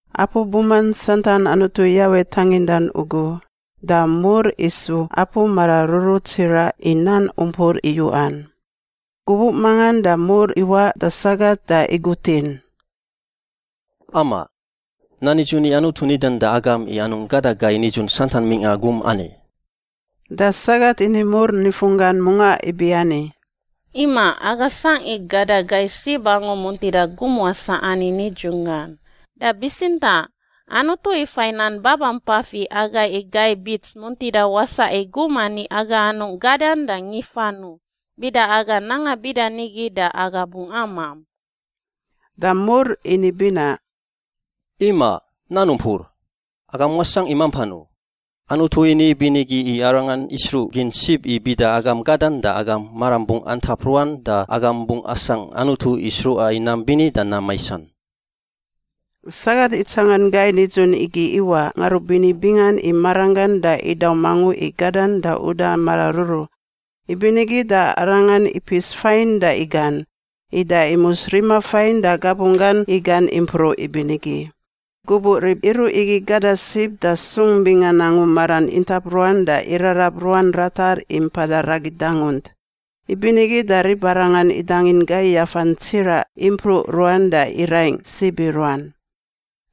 Apu buman santan Anutu Yawe tangindan ugu da mur isu apu mararuru tsiraꞌ i nan umpur iyuꞌan. Gubuꞌ mangan da mur iwaꞌ da sagat da igutin, “Amaꞌ! Nan nidzun i Anutu nidan da agam i anungꞌ gada gai nidzun santan mingꞌa gum ani?” Da sagat ini mur nifunggan mungaꞌ ibiani, “Imaꞌ, aga sangꞌ i gada gai sib angu muntida gum wasaꞌ ani nidzunggan, da bitsintaꞌ Anutu ifai nan babampafan i agai i gai bits muntida wasaꞌ i gum ani aga anungꞌ gadan ma ngifan u, bida aga nanga bida nigi da aga bungꞌ amamp.” Da mur ini binaꞌ, “Imaꞌ! Nan umpur! Agam wasangꞌ i mampan u. Anutu ini ibinigi i arangan isruꞌgin sib i bida agam gadan da agam maram bungꞌ antap ruan da agam bungꞌ asangꞌ Anutu i sruꞌa i nam bini da nam maisan.” Sagat itsangan gai nidzun igi iwaꞌ ngarubini bingan i maranggan da idaum angu i gadan da uda mararuru. Ibinigi da arangan ipis fain da igan, ida imus rima fain da gabunggan igan impruꞌ ibinigi. Gubuꞌ rib iruꞌ igi gada sib da sung bingan angu maran intap ruan da irarab ruan ratar i mpada ragi dangunt; ibinigi da ribarangan idangin gai yafan tsiraꞌ impruꞌ ruan da iraingꞌ sib i ruan.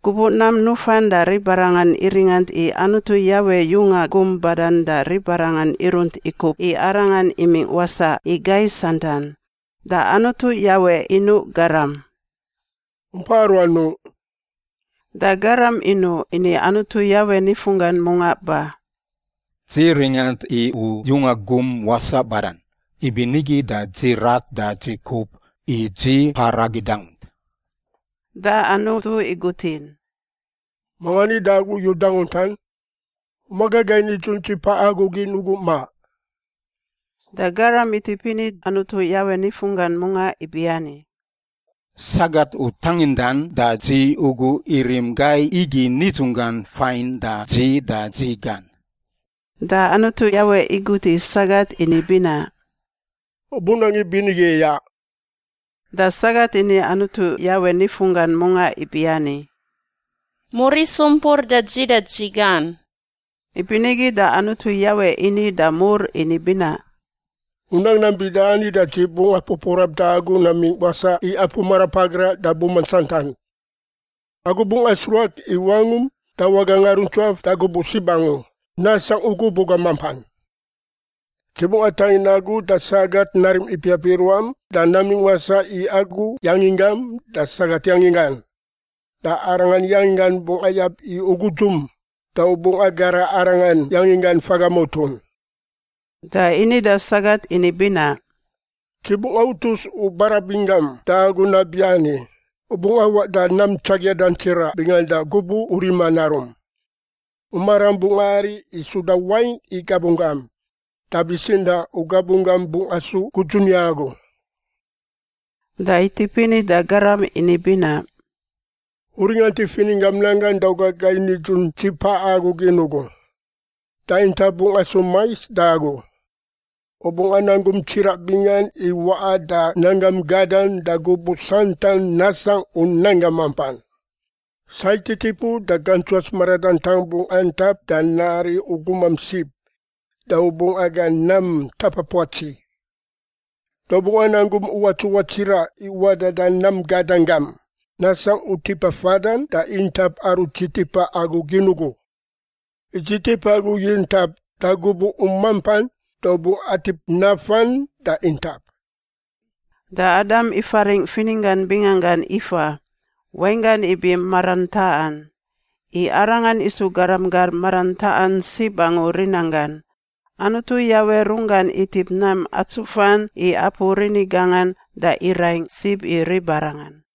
Gubuꞌ nam nufan da ribarangan iringant i Anutu Yawe yunga gum badan da ribarangan irunt ikup i Arangan imingꞌ wasaꞌ i gai santan. Da Anutu Yawe inuꞌ garam, “U mpa aruanungꞌ?” Da garam inuꞌ ini Anutu Yawe nifunggan mungaꞌ ba, “Dzi ringant i u yunga gum wasaꞌ badan, ibinigi da dzi rat da dzi kup, i dzi mpa ragi dangunt.” Da Anutu igutin, “Manga ni da agu i u danguntan? U maga gai nidzun dzi paꞌa agu gin ugu, ma?” Da garam itip ini Anutu Yawe nifunggan mungaꞌ ibiani, “Sagat u tangindan da dzi ugu irim gai igi nidzunggan fain da dzi da dzi gan.” Da Anutu Yawe igut i sagat ini binaꞌ, “U bunang ibinigi iyaꞌ?” Da sagat ini Anutu Yawe nifunggan mungaꞌ ibiani, “Mur isu umpur da dzi da dzi gan.” Ibinigi da Anutu Yawe ini da mur ini binaꞌ, “U nang nam bida ani da dzi bungꞌ apupuarap da agu namingꞌ wasaꞌ i apu marapagraꞌ da buman santan, agu bungꞌ asruak i wangum da waga ngaruntsuaf da gubuꞌ sib angu nasangꞌ u gubuꞌ gam mampan. Dzi bungꞌ atangin agu da sagat narim ipiap i ruam da namingꞌ wasaꞌ i agu yanginggam da sagat yanginggan. Da arangan yanginggan bungꞌ ayab i u gudzum, da u bungꞌ agara arangan yanginggan faga mutun.” Da ini da sagat ini binaꞌ, “Dzi bungꞌ autus u barabin gam da agu nabiani: u bungꞌ awaꞌ da nam tsakiadan tsiraꞌ bingan da gubuꞌ u rima narum. U maram bungꞌ ari i suda wain i gabunggam da bitsintaꞌ u gabunggam bungꞌ asu gudzun i agu.” Da itip ini da garam ini binaꞌ, “U ringant i fininggam nan gan da u ga gai nidzun dzi paꞌa agu gin ugu, da intap bungꞌ asu mais da agu. U bungꞌ anang gum tsiraꞌ bingan i waꞌa da nanggam gadan da gubuꞌ santan nasangꞌ u nanggam mampan. Sai titipu da gantsuats maradantang bungꞌ antap da nari u gumam sib da u bungꞌ aga nam ntapa puatsi. Da u bungꞌ anang gum uwats uwats tsiraꞌ i waꞌa da nam gadan gam, nasangꞌ u tipa fadan da intap aru dzi tipa agu gin ugu. I dzi tip agu i intap da gubuꞌ u mampan da u bungꞌ atip nafan da intap.” Da Adam ifaringꞌ fininggan binganggan Ifa (wainggan ibi marantaꞌan). I arangan isu garam gar marantaꞌan sib angu rinanggan. Anutu Yawe runggan itip nam atsufan i apu rini gangan da iraingꞌ sib i ribarangan.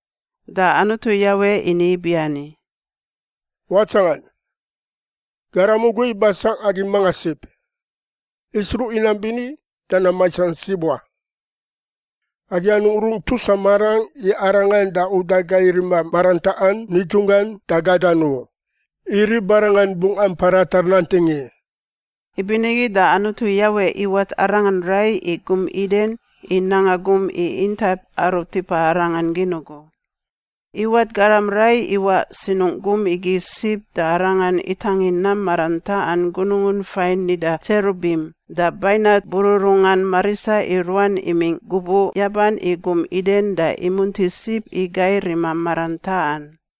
Da Anutu Yawe ini ibiani, “Watsangan! Garam ugu ibasangꞌ agi mangan sib, isruꞌ i nam bini da nam maisan sib wa. Agi anungꞌ rungꞌ tusa marangꞌ i arangan da uda gai rima marantaꞌan nidzunggan da gadan u, i ribarangan bungꞌ ampa ratar nanting i!” Ibinigi da Anutu Yawe iwat arangan rai i gum Iden i nanga gum i intap aru tipa arangan gin ugu. Iwat garam rai iwaꞌ sinungꞌ gum igi sib da Arangan itangin nam marantaꞌan gunungun fain nida tserubim da bainat bururungan marisa i ruan imingꞌ gubuꞌ yaban i gum Iden da imunti sib i gai rima marantaꞌan.